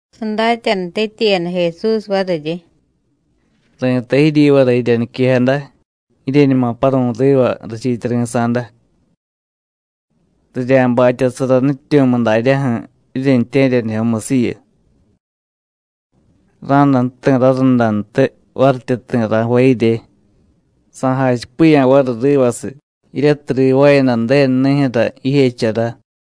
Sadatyanutityiyada Jesús variryi: “Ri̱tay jiryivara jirya niquejada jiryeñuma paru̱y riva rachiityari̱sa̱da. Rirya̱batyasara nutyityu̱miy daryaju̱ jiryentye̱ryanijyomusiyu. Ra̱day ju̱ti̱ rarundantiy varityi ti̱ ra̱jvay jirye, sa̱jachipiya̱ variy rivasiy jiryatiy rivaayada Ju̱denu nijyu̱ra jijechara.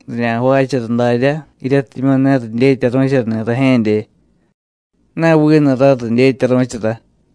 Rirya̱jvaachara daryá, jiryatimyu̱ ne ridyetyaru̱charani̱ rajye̱dye, ne vinu ray ridyetyaru̱chara.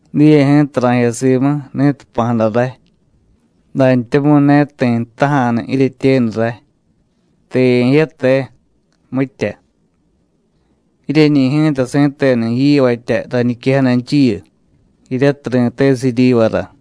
Diye ji̱ta ra̱jiya simu ni̱tiy jpa̱jada ray. Dantyamu̱y ne ti̱ jtaja̱nu jiryetyenu ray: ¿Te ye̱jiya, te? mitya. Jiryeñi̱ ji̱ta si̱tenu yivatya rañiquejadanchiyu, jiryatiy ri̱tesiy jiryivara.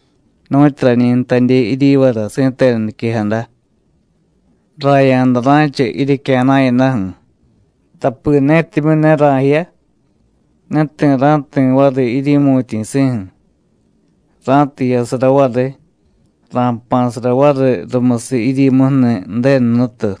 Nu̱tyu rañi jtadye jiryivara si̱tenu niquejada: Raya̱da ra̱cha jiryecya̱na̱yadaju̱. Tapi netimyu̱ ne ra̱jiya, ne ti̱ ra̱jti̱ variy jiryi̱mu̱tyi̱si̱ju̱. Ra̱tiy jiyasara variy, ra̱jpa̱sara variy rumusiy jiryimuju̱ni̱ Ju̱denu Jnutu.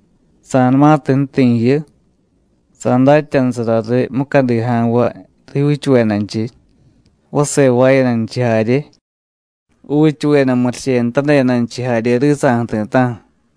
Sa̱numatiy ju̱ti̱ jiyu, sa̱datyanusara riy mucadi ja̱nvay rijyuuchuvedanchiy, vase jvaayadanchiy jarye, juuchuveda murichenutadedanchiy jarye risa̱ju̱ ti̱ta̱ju̱.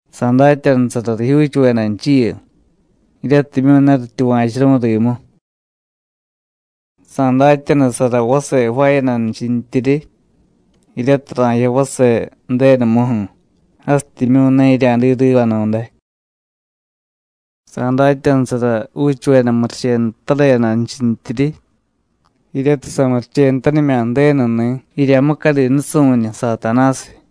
Sa̱datyanusara rijyuuchuvedanchiyu jiryatimyu̱ ne rityuva̱churu̱y rimu. Sa̱datyanusara vase jvaayadanchintiryi, jiryatiy ra̱jiya vase Ju̱denumuju̱, jasityimyu̱ ne jirya̱diy rivanu̱day. Sa̱datyanusara juuchuveda murichenutadedanchintyiryi, jiryatiy samurichenutanimya̱ Ju̱denuni̱ jirya mucadi nusu̱ñu Satanásiy.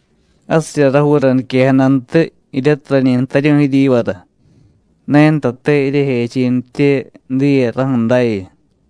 Jasirya rajuura niquejadantiy jiryatiy rañi jtaryu̱y jiryivara. Ne ntate jiryejechi̱nitye diye raju̱ dayu.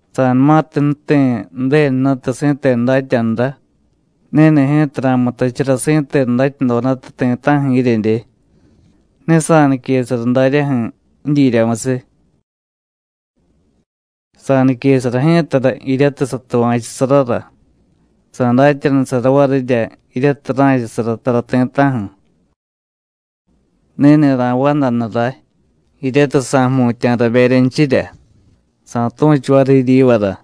Sa̱numatiy ju̱ti̱ Ju̱denu Jnutu si̱tenu datyanurá, ni̱ni̱ ji̱ta ra̱mutachara si̱tenu datyadodata ti̱ta̱ju̱ jiryedye. Ne sa̱niquesara daryaju̱ jidyiryamusiy. Sa̱niquesara ji̱tara jiryatiy satuva̱chusarara, sa̱datyanusara varirya jiryatiy ra̱chasara tara ti̱ta̱ju̱. Ni̱ni̱ ra̱vandanu ray, jiryatiy sa̱jmutya̱ raberyanchirya, sa̱tu̱chu variy jiryivara.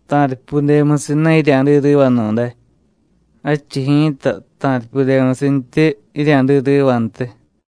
“Ta̱ripyudemusiy ne jirya̱diy rivanu̱day, jadchiy ji̱ta ta̱ripyudemusintyi jirya̱diy rivantiy.”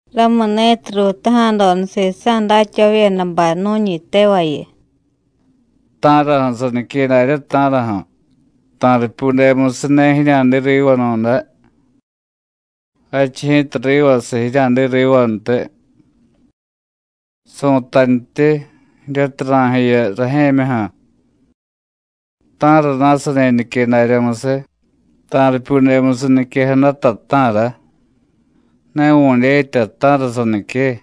Ramuni̱tiy ruutaja̱doda sisa̱ datyavavyedabay nu̱ñi tevayu: “¿Ta̱raju̱ sanique daryá, ta̱raju̱? ta̱ripyudemusiy ne jirya̱diy rivanu̱day, jadchiy ji̱ta rivasiy jirya̱diy rivantiy. Su̱tantyi jiryatiy ra̱jiya rajye̱myuju̱. ¿Ta̱rana̱ sani nique daryamusiy ta̱ripyudemusiy niquejadata, ta̱ra? Ne vu̱dyetya ta̱ra sanique.”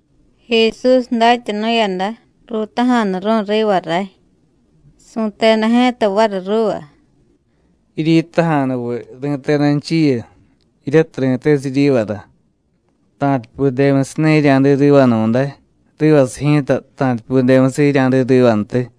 Jesús datyanu̱yada: Ruutaja̱nuru̱y riva ray. Su̱teda ji̱ta variy ruuva: “¿Jiryitaja̱nuviy ri̱tedanchiyu, jiryatiy ri̱tesiy jiryivara: Ta̱ripyudemusiy ne jirya̱diy rivanu̱day, rivasiy ji̱ta ta̱ripyudemusiy jirya̱diy rivantiy?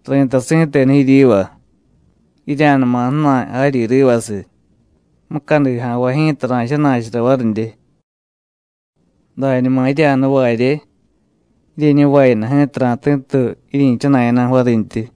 Ri̱tay si̱tenu jiryiva: Jirya̱numa ju̱na̱y jaryi rivasiy, mucadi ja̱nvay ji̱ta ra̱jchana̱chara varidye. Dañuma jirya̱nuvarye, jiryeñuvayada ji̱ta ra̱ti̱tuy jiryi̱chana̱yadaju̱ varintyi.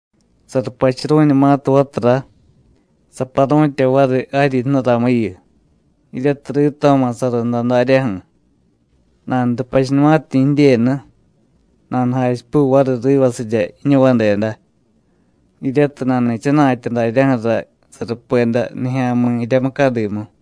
Sarupachuru̱ñumatiy vatura, saparu̱tya variy jaryi jnuramuyu, jiryatiy rito̱ma̱ sarunda daryaju̱. Nanurupachunumatiñi̱ jidyenu, nanujachipuy variy rivasirya jiñuvadeda, jiryatiy nani̱chana̱tya daryaju̱ra sarupeda nijya̱mi̱ jirya mucadimu.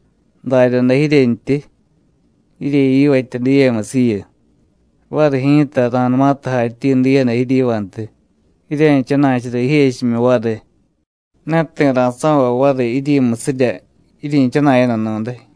Daryaday jiryentyi. Jiryeyivatya diyemusiyu. Variy ji̱ta ra̱numatiy jatyi diyada jiryivantiy, jirya̱jchana̱chara jijechimyu variy, ne ti̱ ra̱so̱vay variy jiryimusirya jiryi̱chana̱yadanu̱day.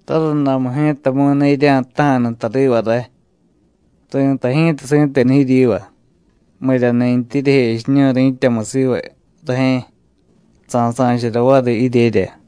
Rarundamu ji̱tamu̱y ne jirya̱jtaja̱nu tariva ray. Ri̱tay ji̱ta si̱tenu jiryiva: Miryani̱ntyi jiryejechiñu̱y ri̱tyamu siva rajye̱, sa̱sa̱chara variy jiryerya.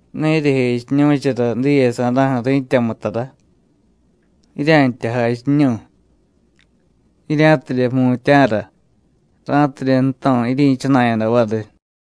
Ne jiryejechiñu̱chara diyesa̱ra̱ju̱ ri̱tyamu tara. Jirya̱ntya jachiñu̱y, jirya̱tidye jmutya̱ra, ra̱tidye ju̱to̱ jiryi̱chana̱yada variy.”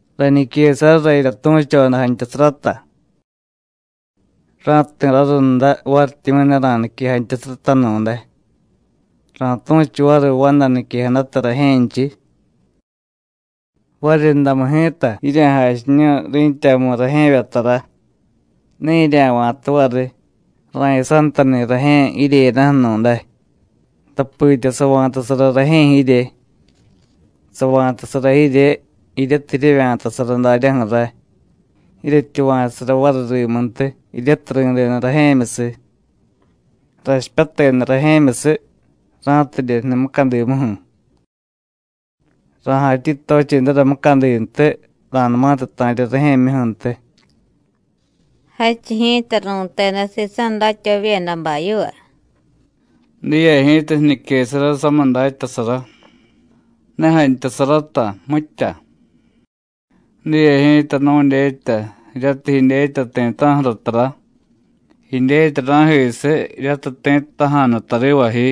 “Rañiquesarara jirya tu̱choda jantyasarata. Ra̱jti̱ ji̱ta rarunda varityimyu̱ ne ra̱nique jantyasaratanu̱day, ra̱tu̱chu variy vanda niquejadata rajye̱nchiy. Variryundamu ji̱ta jirya̱jachiñu̱y ri̱tyamu rajye̱vya tara, ne jirya̱va̱ta variy ra̱jiyasantani̱ rajye̱ jiryeyadaju̱nu̱day, tapitya sava̱tasara rajye̱ jirye. Sava̱tasara jirye, jiryatiy jiryevya̱tasara daryaju̱ ray, jiryetyuva̱chusara variy rimuntiy, jiryatiy ri̱deda rajye̱myusiy. Rachipyateda rajye̱myusiy ra̱tidye jniy mucadimuju̱. Ra̱jatyi tochedara mucadintiy, ra̱numatiy ta̱rya rajye̱myuju̱ntiy.” Jadchiy ji̱ta ru̱teda sisa̱ datyavavyedabay yiva: “Diye ji̱ta jiñiquesara samiy datyasara, ne jantyasarata, mitya. Diye ji̱ta nu̱dyetya jiryatiy jidyetya ti̱ta̱ju̱ra tara, jidyetya ra̱jisiy jiryatiy ti̱ jtaja̱nu tariva ji.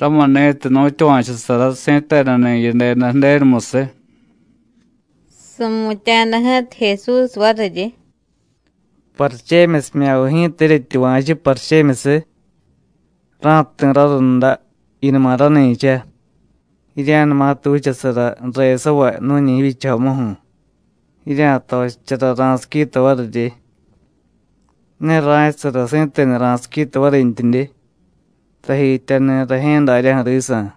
Ramuni̱tiy nu̱tyuva̱chusara si̱tenuni̱ yideda Ju̱denumusiy.” Su̱mutya̱jada ji̱ta Jesús variryi: “¿Parichemyusimya̱viy ji̱ta jiryetyuva̱chu, parichemyusiy? Ra̱jti̱ rarunda, jiyunuma rani̱cha, jirya̱numatiy vichasara ju̱resavay nu̱ñi jivyichajomu, jirya̱tochichara ra̱siquita varirye. Ne ra̱chasara si̱tenu ra̱siquita varintyidye, tajityani̱ rajye̱ daryaju̱ risa̱.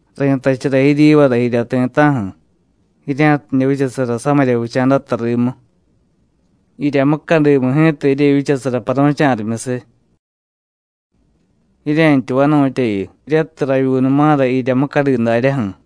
Ri̱tachara jiryivara jirya ti̱ta̱ju̱, jirya̱tidye vichasara samirya vicha̱data rimu. Jirya mucadimu ji̱ta, jiryevyichasara paru̱cha̱rimyusiy. Jirye̱ntya vanu̱tyayu, jiryatiy ravyuunuma̱ra jirya mucadi daryaju̱.”